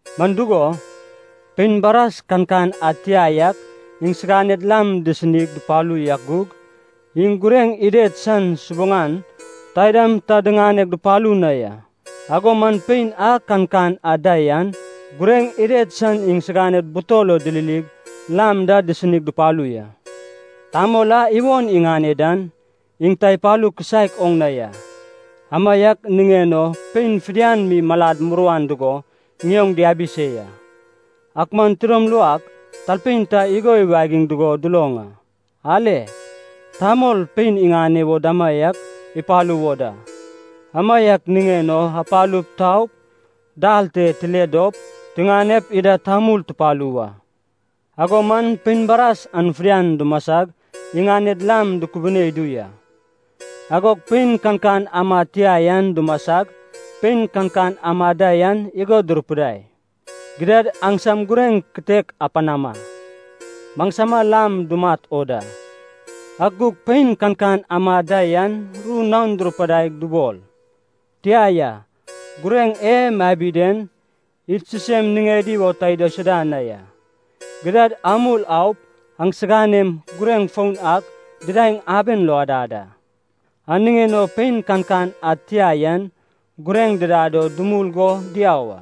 Man dugo, pein baras kankan ad tia yak iŋsiganed lam disinig dupalu yak gug, iŋ gureŋ ided san subuŋan taidam ta diŋaneg dupalu na ya. Ago man pein a kankan ad da yan gureŋ ided san iŋsiganed butol lo dililig lam da disinig dupalu ya. Tamol a iwon iŋane dan, iŋ ta ipalu kisaek oŋ na ya, amaiak niŋen o pein fidian mi malad muruan dugo ŋioŋ diabi se ya. “Ak man tidom luak talpein ta igo iwagiŋ dugo duloŋ a, ‘Ale, tamol, pein iŋane wo damaiak ipalu wo da! Amaiak niŋen o apalup tau, dal te tile dop tiŋanep ida tamul tupalu wa.’ Ago man pein baras an fidian dumasag iŋaned lam dukubine idu ya. Agog pein kankan amad tia yan dumasag, pein kankan amad da yan igo durupidai, ‘Gidad aŋsam gureŋ kitek apanama. Maŋsama lam dumat o da.’ “Ak gug pein kankan amad da yan ru naon durupidaig dubol, ‘Tia ya, gureŋ e mabi den, id sisem niŋed o ta idaisuda na ya. Gidad amul aup aŋsiganem gureŋ foun ak didaeŋ aben lo adad a.’ “An niŋen o pein kankan ad tia yan gureŋ didad o dumul go diau a.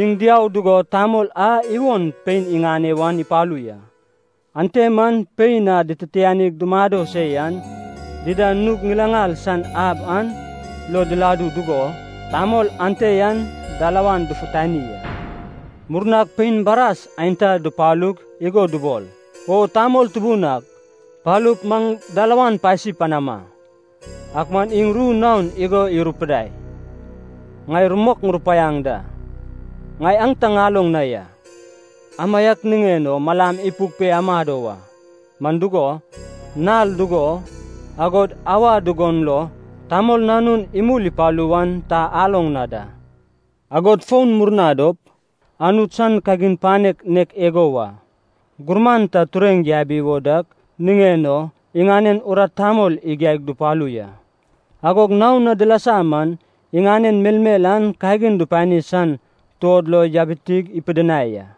Iŋ diau dugo tamol a iwon pein iŋane wan ipalu ya. Ante man pein a dititianig dumado se yan, dida nug ŋilaŋal san ab an lo diladu dugo, tamol ante yan dalawan dufutani a. “Murnag pein baras aenta dupalug igo dubol, ‘O tamol tubun ak, palup maŋ dalawan pasi panama!’ “Ak man iŋ ru naon igo irupidai, ‘Ŋai rumok ŋurupaiaŋ da, ŋai aŋ ta ŋaloŋ na ya.’ “Amaiak niŋen o malam ipuk pe amado wa. Man dugo, nal dugo, agod auwa dugon lo Tamol Nanun imul ipalu wan ta aloŋ na da.” “Agod fon, murna dop Anut san kagin panek nek igo wa. Gurman ta tureŋ yabi wo dak niŋen o iŋanen urat tamol igiaig dupalu ya. Agog naon na dilasa man iŋanen melmel an kagin dupani san tuod lo yabitig ipidinai a.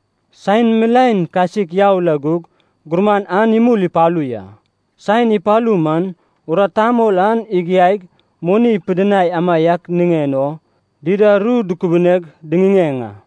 “Saen milaen kasik yau la gug, gurman an imul ipalu ya. Saen ipalu man urat tamol an igiaig moni ipidinai amaiak niŋen o, dida ru dukubuneg diŋiŋeŋ a.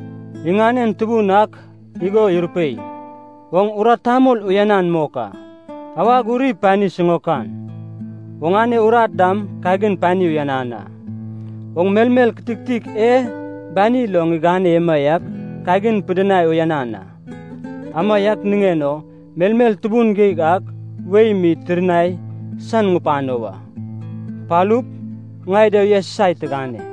“Iŋanen tubun ak igo irupei, ‘Oŋ urat tamol uyanan mok a, awag uri pani siŋaokan, oŋane urat dam kagin pani uyanan a. Oŋ melmel kititik e bani lo ŋigane emaiak kagin pidinai uyanan a, amaiak niŋen o melmel tubun geig ak wei mi tirnai san ŋupano wa. Palup, ŋai da uyasusai tigane.’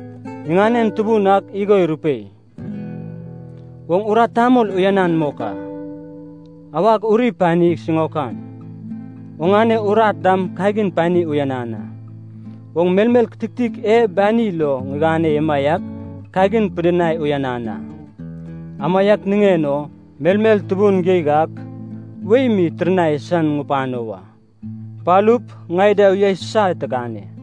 “Iŋanen tubun ak igo irupei, ‘Oŋ urat tamol uyanan mok a, awag uri pani siŋaokan, oŋane urat dam kagin pani uyanan a. Oŋ melmel kititik e bani lo ŋigane emaiak kagin pidinai uyanan a, amaiak niŋen o melmel tubun geig ak wei mi tirnai san ŋupano wa. Palup, ŋai da uyasusai tigane.’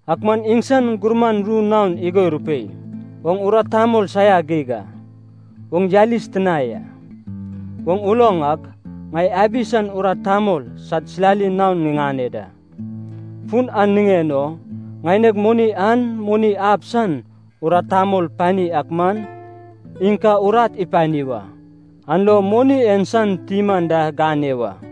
“Ak man iŋsan gurman ru naon igo irupei, ‘Oŋ urat tamol saia geig a. Oŋ yalis tina ya. Oŋ uloŋ ak, ŋai abi san urat tamol sad silali naon ŋiŋane da. Fun an niŋen o ŋaineg moni an moni ab san urat tamol pani ak man, iŋ ka urat ipani wa, an lo moni en san tim anda ŋane wa.’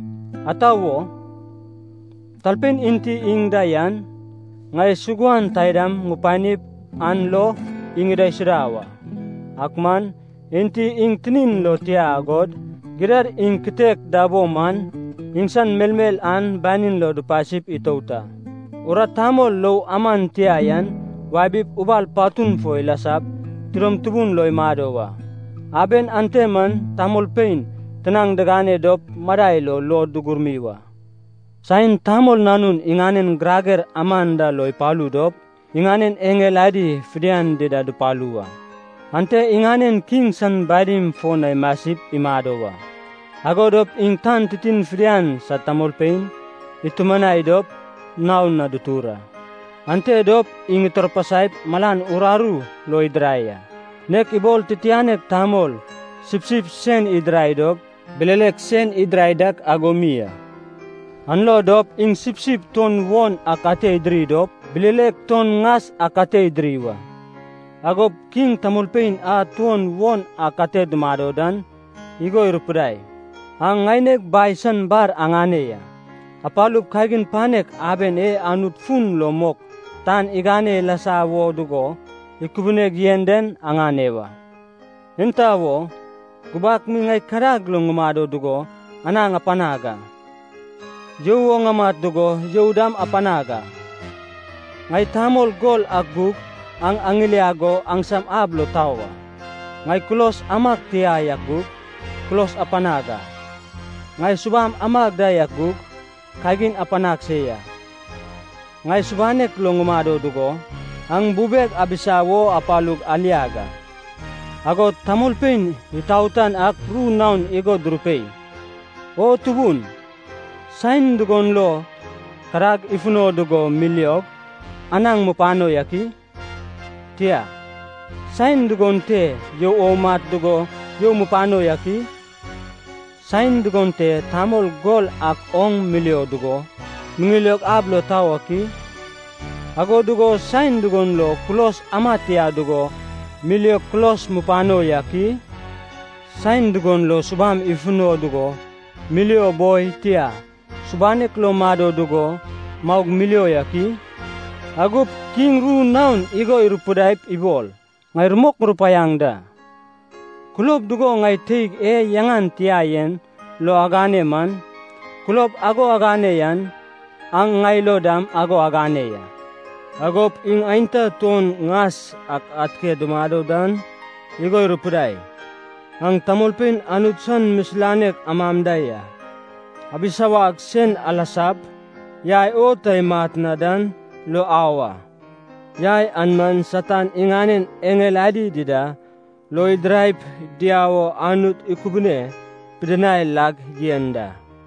Ata wo? Talpein enti iŋ da yan, ŋai suguan taidam ŋupanip an lo iŋ idaisuda wa. Ak man, enti iŋ tinin lo tia agod, gidad iŋ kitek da bo man, iŋsan melmel an banin lo dupasi itout a. Urat tamol lou aman tia yan wabip ubal patun fo ilasap tidom tubun lo imado wa. Aben ante man tamolpein tinaŋ digane dop madai lo luod dugurmi wa.’ “Saen Tamol Nanun iŋanen girager aman da lo ipalu dop iŋanen eŋel adi fidian dida dupalu wa. Ante iŋanen kiŋ san badim fo na imasip imado wa. Ago dop iŋ tan titin fidian sad tamolpein itumanai dop naon na dutur a. Ante dop iŋ itarpasaip malan uraru lo idirai a, nek ibol titianek tamol sipsip sen idirai dop bilelek sen idirai dak ago mi a. An lo dop iŋ sipsip tuon won ak ate idiri dop, bilelek tuon ŋas ak ate idiri wa. “Agop Kiŋ tamolpein a tuon won ak ate dumado dan, igo irupidai, ‘Aŋ ŋaineg Bai san bar aŋane ya. Apalup kagin panek aben e Anut fun lo mok tan igane ilasa wo dugo ikubuneg yen den aŋane wa. Enta wo? Gubak mi ŋai kadag lo ŋumado dugo anaŋ apanag a. You o ŋamat dugo you dam apanag a. Ŋai tamol gol ak gug aŋ aŋiliag go aŋsam ab lo tau a. Ŋai kulos amag tia yak gug, kulos apanag a. Ŋai subam amag da yak gug, kagin apanag se ya. Ŋai subanek lo ŋumado dugo, aŋ bubeg abisa wo apalug aliag a.’ “Agod tamolpein itaotan ak ru naon igo durupei, ‘O Tubun, saen dugon lo kadag ifuno dugo miliog, anaŋ mupano yak i? Tia, saen dugon te you o umat dugo you mupano yak i? Saen dugon te tamol gol ak oŋ milio dugo miŋilio ab lo tau ak i? Ago dugo saen dugon lo kulos ama tia dugo miliog kulos mupano yak i? Saen dugon lo subam ifuno dugo milio boi, tia, subanek lo mado dugo maug milio yak i?’ “Agop Kiŋ ru naon igo irupidaip ibol, ‘Ŋai rumok ŋurupaiaŋ da, kulob dugo ŋai teig e yaŋan tia yen lo agane man, kulob ago agane yan, an ŋai lo dam ago agane ya.’ “Agop iŋ aenta tuon ŋas ak ate dumado dan igo irupidai, ‘Aŋ tamolpein Anut san misilanek am da ya, abisawag sen alasap, yai o ta imat na dan lo au a. Yai an man Satan iŋanen eŋel adi dida lo idiraip diau o Anut ikubune pidinai lag yen da.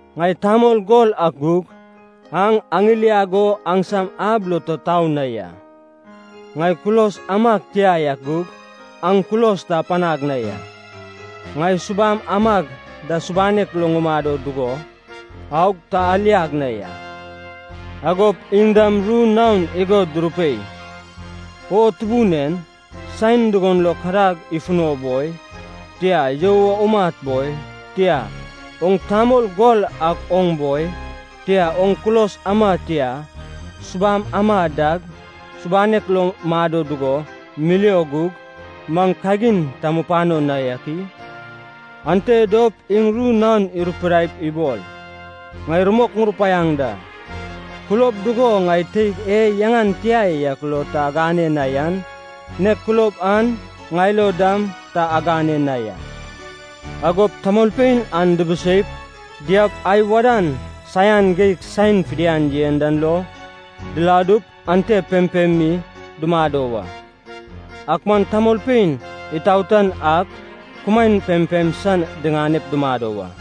Ŋai tamol gol ak gug, aŋ aŋiliag go aŋsam ab lo ta tau na ya. Ŋai kulos amag tia yak gug, aŋ kulos ta apanag na ya. Ŋai subam amag da subanek lo ŋumado dugo, aug ta aliag na ya.’ “Agop iŋ dam ru naon igo durupei, ‘O Tubun en, saen dugon lo kadag ifuno boi, tia, you o umat boi, tia, oŋ tamol gol ak oŋ boi, tia, oŋ kulos ama tia, subam ama dag, subanek lo mado dugo milio gug, maŋ kagin ta mupano na yak i?’ Ante dop iŋ ru naon irupidaip ibol, ‘Ŋai rumok ŋurupaiaŋ da, kulob dugo ŋai teig e yaŋan tia yak lo ta agane na yan, nek kulob an ŋai lo dam ta agane na ya.’ Agop tamolpein an dibiseip diaup ai wadan saian geig saen fidian yen dan lo diladup ante pempem mi dumado wa. Ak man tamolpein itaotan ak kumaen pempem san diŋanep dumado wa.”